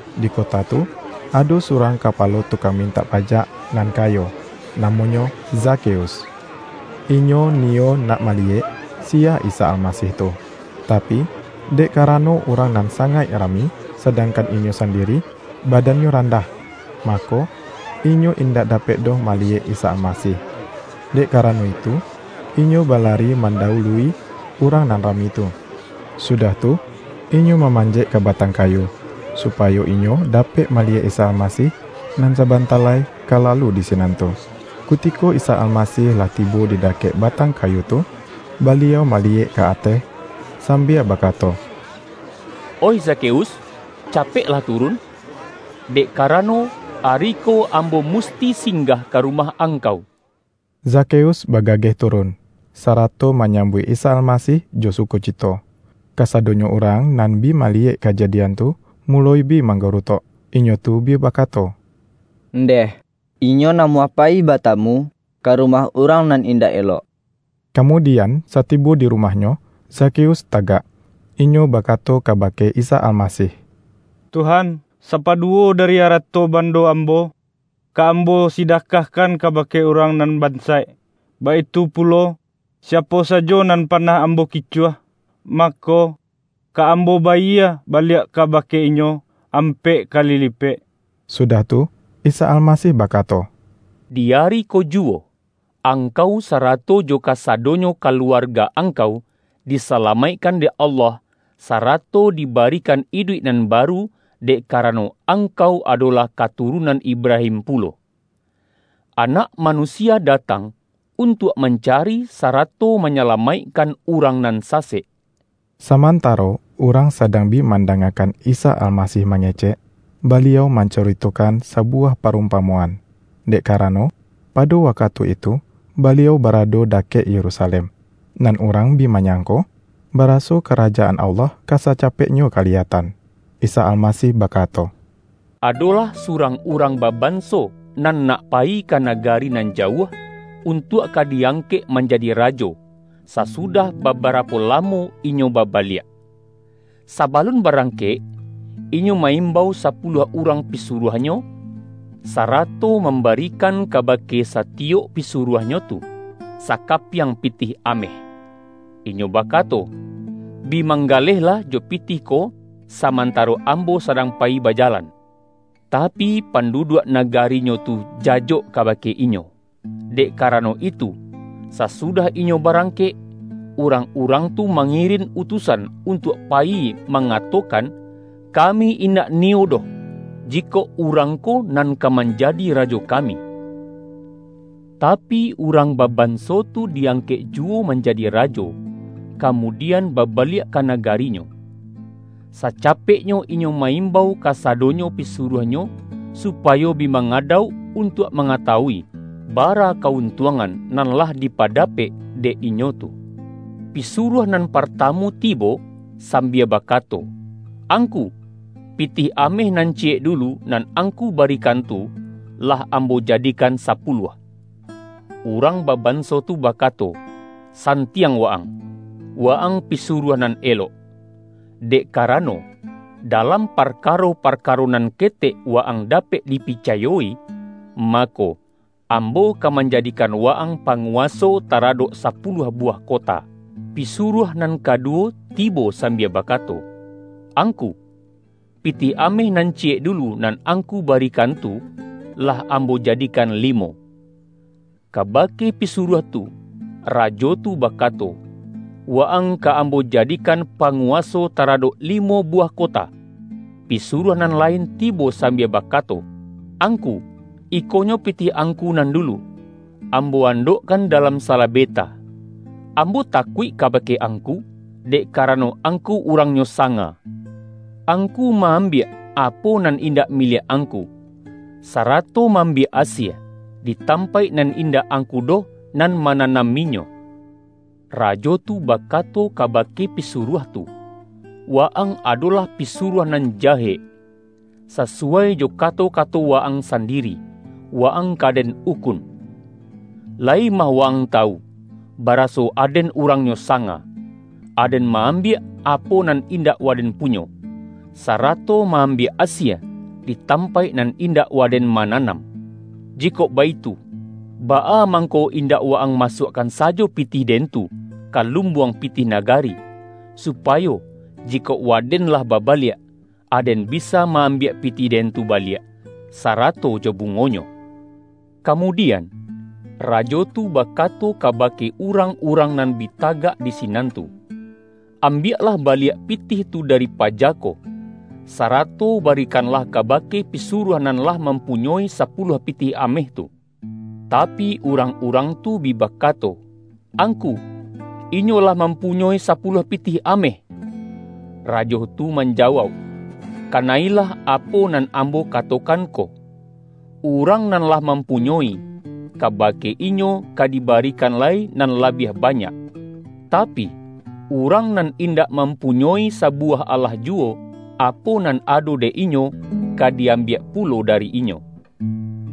Di kota tu, ado surang kapalo tukang mintak pa-jak nan kayo. Namonyo Zakheus. Inyo niyo nak maliyek, siya Isa Almasih tu, tapi, dek karano urang nan sangaik ra-mi, sadangkan inyo sandiri, badannyo randah, mako, inyo indak dapek doh maliyek Isa Almasih. Dek karano itu, inyo balari mandawului urang nan rami tu, sudah tu, inyo mamanjek ka batang kayu, supayo inyo dapek maliyek Isa Almasih, nan sabanta lai ka lalu di si-nan tu. Kutiko Isa Almasih lah tibo di dakek batang kayu tu, Baliau maliyek ka ateh sambia bakato,”Oih Zakheus, capeklah turun! Dek karano, ari ko Am-bo musti singgah ka rumah angkau.” Zakheus bagageh turun, sarato manyambuik Isa Almasih jo sukocito. Kasadonyo urang nan bi maliyek ka-jadian tu, muloi bi manggarutok. Inyo tu bi bakato,”Ndeh! Inyo namuah pa-yi batamu, ka rumah urang nan in-dak elok!” Kamudian, satibo di rumahnyo, Zakheus tagak, inyo bakato kabake Isa Almasih,”Tuhan, sapaduwo dari arato bando ambo, ka ambo sidakah-kan kabake urang nan bansaik; baitu pulo, siapo sajo nan panah ambo ki-cuah, mako, ka ambo bayie baliak ka-bake inyo, ampek kali lipek!” Sudah tu, Isa Almasih bakato,”Di ari ko juwo, angkau sarato jo kasado-nyo kaluarga angkau, disalamaikkan dek Allah, sarato dibarikan iduik nan baru, dek karano, angkau adolah katu-runan Ibrahim pulo. Anak Manusia datang untuak mancari, sarato manya-lamaikkan urang nan sasek.” Samantaro urang sadang bi manda-ngakan Isa Almasih mangecek, Baliau mancuritokan sabuwah parumpamoan. Dek karano, pado wakatu itu Baliau barado dakek Yerusalem, nan urang bi manyangko, baraso Karajaan Allah ka sacapeknyo kaliyatan. Isa Almasih bakato,”Adolah surang urang baban-so, nan nak payi ka nagari nan jauah, untuak ka di-angkek manjadi rajo, sa-sudah babarapo lamo, inyo babaliak. Sabalun barangkek, inyo ma-im-bau sapuluah urang pisuruahnyo, sa-rato mambarikan kabake satiyok pisu-ruahnyo tu sakapiang pitih ameh. Inyo bakato ’Bi manggalehlah jo pitih ko samantaro ambo sadang payi baja-lan.’ Tapi, panduduak nagarinyo tu jajok kabake inyo. Dek karano itu, sa-sudah inyo barangkek, urang-urang tu mangirin utusan untuak payi ma-ngatokan, ’ Kami indak niyo doh, ji-kok urang ko nan ka manjadi rajo kami.’ Tapi, urang babanso tu di-angkek juwo manjadi rajo, kamudian babaliak ka nagarinyo. Sacapeknyo inyo ma-im-bau kasadonyo pisuruahnyo supayo bi mangadauk, untuak mangatawui bara ka-untungan nan lah dipadapek dek inyo tu. Pisuruah nan partamu ti-bo, sambia bakato, ’Angku, pitih ameh nan ciyek dulu, nan angku barikan tu, lah ambo jadikan sapuluah.’ Urang babanso tu bakato, ’Santiang wa-ang, wa-ang pisuruah nan elok! Dek kara-no, dalam parkaro-parkaro nan ke-tek wa-ang dapek dipicayo-i, mako, ambo ka manjadikan wa-ang pangu-waso taradok sapuluah buwah kota.’ Pisuruah nan kaduwo tibo sambia bakato, ’Angku, pitih ameh nan ciyek dulu, nan angku barikan tu, lah am-bo jadikan limo.’ Kabake pisuruah tu, rajo tu bakato, ’Wa-ang ka ambo jadikan panguwaso taradok limo bu-wah kota.’ Pisuruah nan lain tibo sambia bakato, ’Angku, ikonyo pitih angku nan dulu; ambo andokkan da-lam salabeta. Ambo takuik kabake angku, dek karano angku urangnyo sanga. Angku ma-ambiak apo nan in-dak miliak angku, sarato ma-ambiak asie, di tampaik nan indak angku doh nan mananaminyo.’ Rajo tu bakato kabake pisuruah tu, ’Wa-ang adolah pisuruah nan jahek! Sasuwai jo kato-kato wa-ang sandiri, wa-ang ka den ukun. Layi mah wa-ang tawu, bara-so aden urangnyo sanga: aden ma-am-biak, apo nan indak waden punyo, sa-rato ma-ambiak asie, di tampaik nan indak waden mananam. Jikok baitu, baa mangko indak wa-ang masuak-kan sajo pitih den tu, ka Lumbuang Pitih Nagari, supayo jikok waden lah babaliak, aden bisa ma-ambiak pitih den tu baliak sarato jo bungonyo?' Kamudian, rajo tu bakato kabake urang-urang nan bi tagak di sinan tu, ’Ambiaklah baliak pitih tu dari paja ko, sarato barikanlah kabake pisuruah nan lah mampunyoi sapuluah pitih ameh tu.’ Tapi, urang-urang tu bi bakato, ’Angku, inyo lah mampunyoi sapuluah pitih ameh.’ Rajo tu man-jawauk, ’ Kana-ilah apo nan ambo ka-tokan ko: urang nan lah mampunyoi, kabake inyo ka dibarikan lai nan la-biah banyak. Tapi, urang nan indak mampunyoi sabuwah alah juwo, apo nan ado dek inyo, ka di-ambiak pulo dari inyo.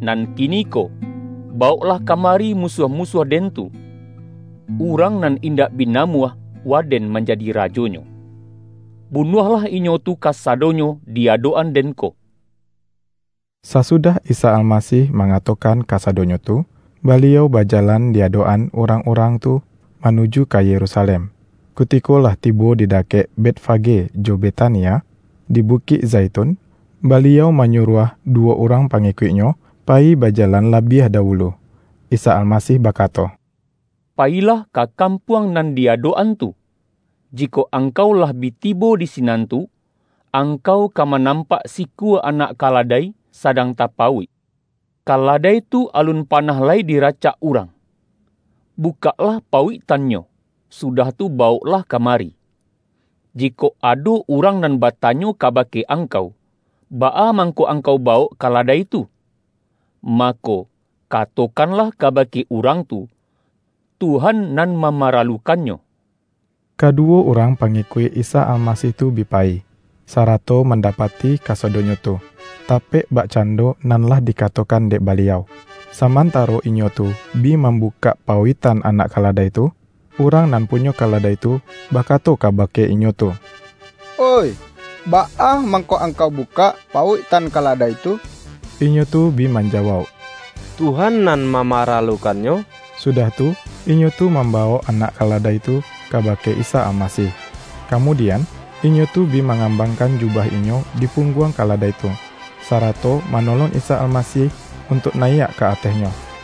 Nan kiniko, bawoklah ka mari musuah-musuah den tu, urang nan indak bi namuah waden manja-di rajonyo. Bunuahlah inyo tu kasa-donyo di adok-an den ko!'” Sasudah Isa Almasih mangato-kan kasadonyo tu, Baliau bajalan di adok-an urang-urang tu manuju ka Yerusalem. Kutiko lah tibo di da-kek Betfage jo Betania, di Bukik Zai-tun, Baliau manyuruah duwo urang pangikuik-Nyo payi bajalan labiah da-wulu. IsaAlmasih bakato,”Payilah ka kampuang nan di adok-an tu, jikok angkau lah bi tibo di sinan tu, ang-kau ka manampak sikua anak kala-dai sadang ta-pauik. Kaladai tu alun panah lai diracak urang. Bukaklah pauiktannyo, sudah tu bawoklah ka-mari. Jikok ado urang nan batanyo kabake angkau, ’Baa mangko angkau bawok kaladai tu?' mako, katokanlah kabake urang tu, ’Tuhan nan mama-ralukannyo.’” Kaduwo urang pangikuik Isa Almasih tu bi payi, sarato mandapati ka-sadonyo tu, tapek bakcando nan lah di-katokan dek Baliau. Samantaro inyo tu bi mambukak pauiktan anak kaladai tu, urang nan punyo kaladai tu, bakato kabake inyo tu,”Oih, baa mangko ang-kau bukak pauiktan kaladai tu?” Inyo tu bi manjawauk,”Tuhan nan mamaralukannyo.” Sudah tu, inyo tu mambawok anak kaladai tu kabake Isa Almasih. Kamudian, inyo tu bi ma-ngambangkan jubah inyo dipungguang kaladai tu, sarato manolong Isa Almasih untuak nayiak ka atehnyo.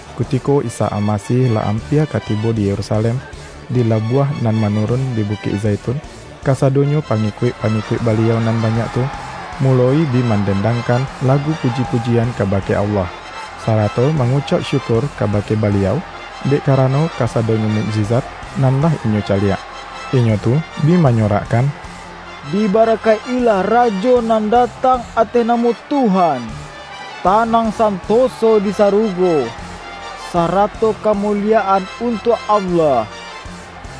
Kutiko Isa Almasih lah ampia ka tibo di Yerusalem, di labuah nan manurun di Bukik Zaitun, kasadonyo pangikuik-pa-ngikuik Baliau nan banyak tu, muloi bi mandendangkan lagu puji-pujian kabake Allah, sarato mangucauk syukur kabake Baliau, dek karano kasadonyo mukjizat nan lah inyo caliak. Inyo tu bi manyo-rakkan,”Dibarakaik-ilah Rajo nan datang ateh namo Tuhan! Tanang santoso di saru-go, sarato kamuliyaan untuak Allah!”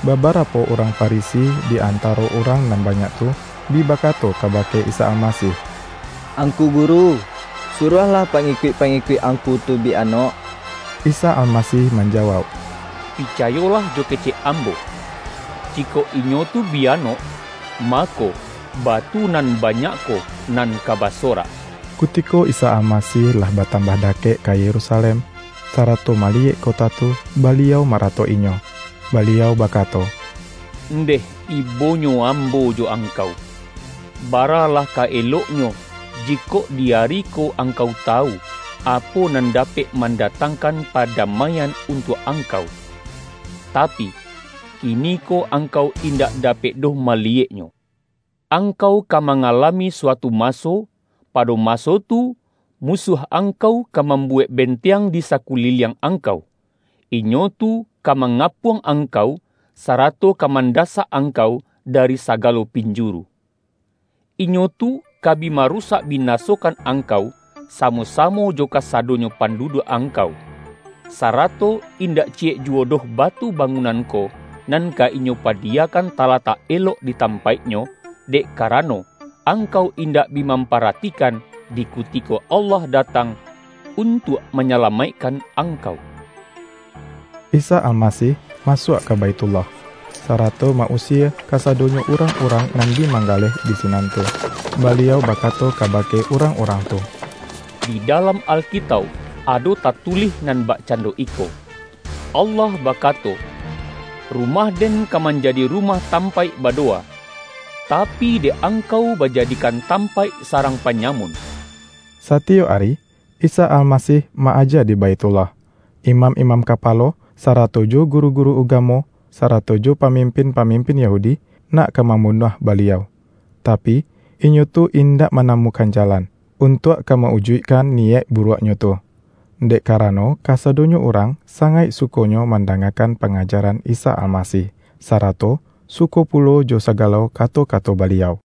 Babarapo urang Farisi di antaro urang nan banyak tu, bi bakato kabake Isa Almasih,”Angku Guru, suruahlah pa-ngikuik-pangikuik Angku tu bi anok.” Isa Almasih manjawauk,”Picayolah jo kecek Ambo! Jikok inyo tu bi anok, ma-ko batu nan banyak ko nan ka basorak.” Kutiko Isa Almasih lah batambah da-kek ka Yerusalem, sarato maliyek kota tu, Baliau maratok-inyo. Baliau bakato,”Ndeh ibonyo Ambo jo angkau, baralah ka eloknyo, jikok di ari ko angkau tawu, apo nan dapek mandatangkan padamai-an untuak angkau! Tapi, kiniko angkau indak dapek doh maliyeknyo. Angkau ka mangalami suatu maso, pado maso tu, musuah angkau ka mambuwek benteang di sakuliliang angkau; inyo tu ka manga-puang angkau, sarato ka mandasak ang-kau, dari sagalo pinjuru. Inyo tu ka bi marusak binasokan angkau, samo-samo jo kasadonyo panduduak angkau; sarato in-dak ciyek juwo doh batu bangunan ko, nan ka inyo padiyakan talatak elok di tampaik-nyo, dek karano angkau indak bi mam-paratikan, di kutiko Allah datang untuak manyalamaikkan angkau!” Isa Almasih masuak ka Baithullah, sarato ma-usie kasadonyo urang-urang nan bi manggaleh di sinan tu. Baliau bakato kabake urang-urang tu,”Di dalam Alkitauk, ado tatulih nan bak-cando iko: Allah bakato, ’Rumah-Den ka manjadi rumah tampaik badowa.’ Tapi, dek angkau bajadikan tampaik sarang panyamun!” Satiyok ari, Isa Almasih ma-aja di Baithullah. Imam-imam kapalo, sa-rato jo guru-guru ugamo, sarato jo pamimpin-pamimpin Yahudi, nak ka mambunuah Baliau, tapi, inyo tu indak manamukan jalan, untuak ka ma-ujuikkan niyaik buruaknyo tu, dek karano kasadonyo urang sangaik su-konyo mandangakan pangajaran Isa Almasih, sarato suko pulo jo sagalo kato-kato Baliau.